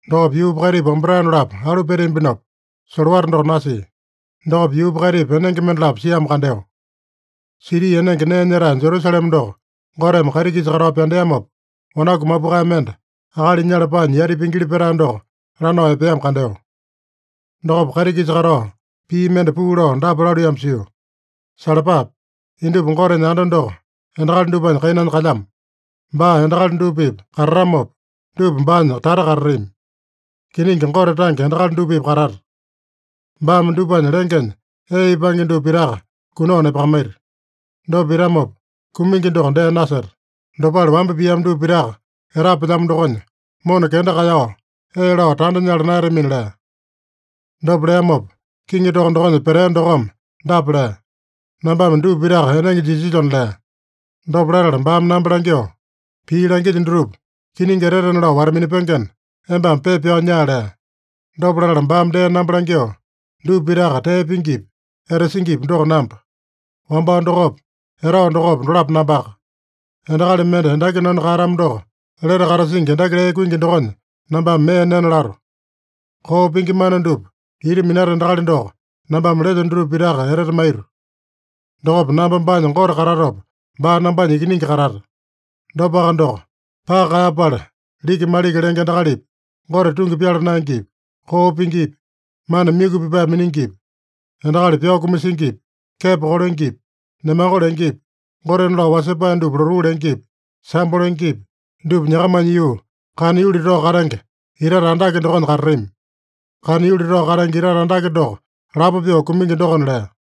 Dokopa yuupa kaitipa wambatae dolapo alu peteambinopa, solowata doko nasia. Dokopa yuupa kaitipa enenge mendalapo siamo kandeo. Siti enenge nee nyetae Jerusalema doko Goteme kaiti-kisa katao pyandeamopa, wanaku mapukae mende akali nyala paanya yati pingili petae doko lanao epeamo kandeo. Dokopa kaiti-kisa katao, pii mende puu lao dapa laluiyamo sio: “Salapape! Indupa Gotenya anda doko endakali dupanya kainanya kalyamo. Baa endakali dupa-pipa katatamopa, dupa baanya tata katatami. Kiningi, Gote tange endakali dupa-pipa katata. Baame dupanya lengenya ee ipange dupa pitaka kunao nepakamaita. Dopa pitamopa, kumingi doko dee naseta. Dopale wamba piamo dupa pitaka etapelyamo dokonya, mona kenda kaeyao ee lao tanda nyala naeyatamina” lea. Dopa leamopa, kiŋi toko dokonya petea dokome dapa lea: “Nambame dupa pitaka enenge jisilyona” lea. Dopa latala baame namba langyoo, “Pii langilyo dutupa kiningi etetena lao wata-minapengena, embame pepa pyao nyaa” lea. Dopa latala baame dee namba langyoo, “Dupa pitaka tee pingipi, etasingipi doko namba. Wambao dokopa, etao dokopa, dolapo nambaka. Endakali mende endaki nanu kaeyatamo doko, lete katasingi endaki lee kuingi dokonya nambame mee nena lato. Koo pingi mana dupa ita minata endakali doko nambame lelyo dutupa pitaka etete maito. Dokopa namba baanya Gote katatopa, baa nambanya ikiningi katata. Dopaka doko, paka kaeyapala liki-maliki lenge endakalipi, Gote tungi pyala naengepi, koo pingipi, mana myuku pipae miningipi, endakali pyao kumasingipi, kepo kolengepi, nemango lengepi, gotena lao wasepae dupa lotuu lengepi, sambo lengepi, dupa nyakamanya yuu, kana yuli tao katenge itate andake dokonya katatami. Kana yuli tao katenge itate andake doko lapo pyoo kumingi dokona” lea.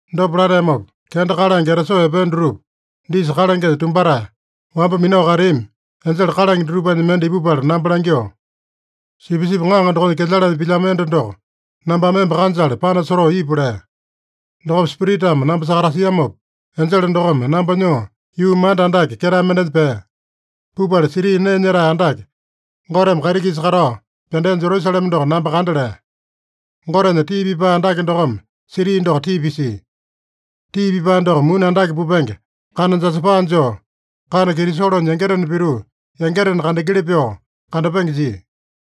Dopa lateamopa, kenda kalange etasoo epea dutupa disa kalangenya tumbatae, wamba minao kateami enjele kalange dutupanya mende ipupala namba langyoo, “Sipisipi Ŋaŋa dokonya kelyalanya pilyamo enda doko nambame emba kanjale panasotoo ipu” lea. Dokopa Spiritame namba sakatasiamopa, enjele dokome namba nyoo, yuu manda andake ketae mendenya pea. Pupala, siti nee nyetae andake Goteme kaiti-kisa katao pyandea Jerusalema doko namba kanda lea. Gotenya tii pipae andake dokome siti doko tii pisia. Tii pipae doko muni andake pupenge kana jasapa joo, kana kitisolonya yangitena pituu yangitena kandengeli pyoo kandapenge jia.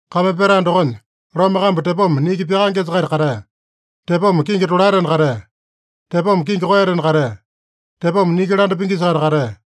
Kame petae dokonya lome kambu tepoma niki pyakaengesa-kaita katea. Tepoma kingi tolaetena katea. Tepoma kingi koeyatena katea. Tepoma niki landa pingisa-kaita katea.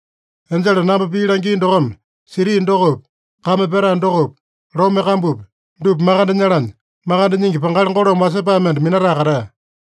Enjele namba pii langia dokome siti dokopi, kame petae dokopi, lome kambupi, dupa makande nyalanya makande nyingi pangali golome wasepae mende minatae katea.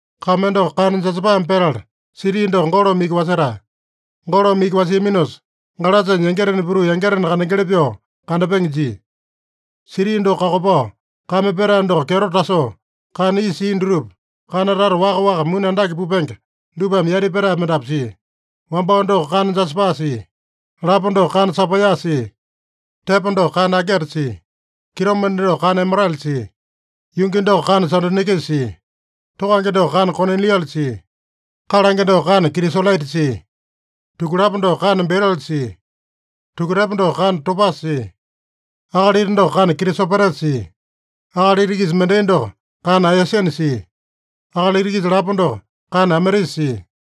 Kame doko kana jasapame petala, siti doko golome iki wasetae. Golome iki wasiaminosa, galasanya yangitena pituu yangitena kandengeli pyoo kandapenge jia. Siti doko kakopao kame petae doko kyeto tasoo, kana isa sia dutupa, kana tata waka-waka muni andake pupenge dupame yati petae mendapu sia. Wambao doko kana jasapa sia. Lapo doko kana sapaiya sia. Tepo doko kana ageta sia. Kitomende doko kana emerale sia. Yungi doko kana sadonikisa sia. Tokange doko kana koniliane sia. Kalange doko kana kitisolaita sia. Tukulapo doko kana berila sia. Tukutepo doko kana topasa sia. Akalita doko kana kitisopetesa sia. Akalita-kisa mendai doko kana aeyasina sia. Akalita-kisa lapo doko kana ametisa sia.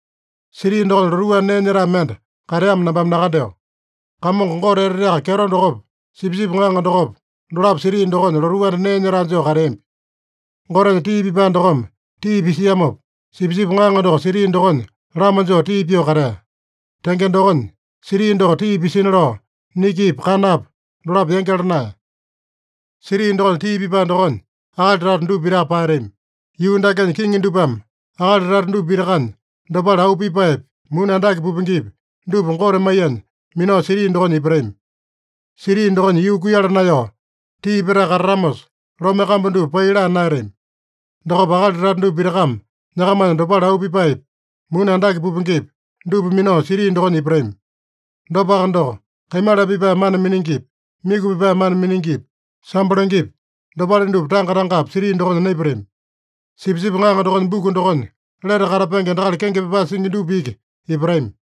Siti dokonya lotuu anda nee nyetae mende kateamo nambame nakandeo. Kamongo Gote Eteteaka Kyeto dokopa, Sipisipi Ŋaŋa dokopa, dolapo siti dokonya lotuu anda nee nyetae joo kateambi. Gotenya tii pipae dokome tii pisiamopa, Sipisipi Ŋaŋa doko siti dokonya lama joo tii pyoo katea. Tenge dokonya, siti doko tii pisina lao, nikipa kanapa dolapo yangyala naeya. Siti dokonya tii pipae dokonya akali tata dupa pitaka paeyatami. Yuu dakenya kiŋi dupame akali tata dupa pitakanya dopale auu pipaepi, muni andake pupengepi, dupa Gote maiyanya minao siti dokonya ipatami. Siti dokonya yuu kuiyala naeyao, tii petae katatamosa, lome kambu dupa pai laa naeyatami. Dokopa akali tata dupa pitakame nyakamanya dopale auu pipaepi, muni andake pupengepi, dupa minao siti dokonya ipatami. Dopaka doko, kaimala pipae mana miningipi, myuku pipae mana miningipi, sambo lengepi, dopale dupa tanga-tangapi siti dokonya naipatami. Sipisipi Ŋaŋa dokonya buku dokonya lete katapenge endakali kenge pyapae singi dupa iki ipatami.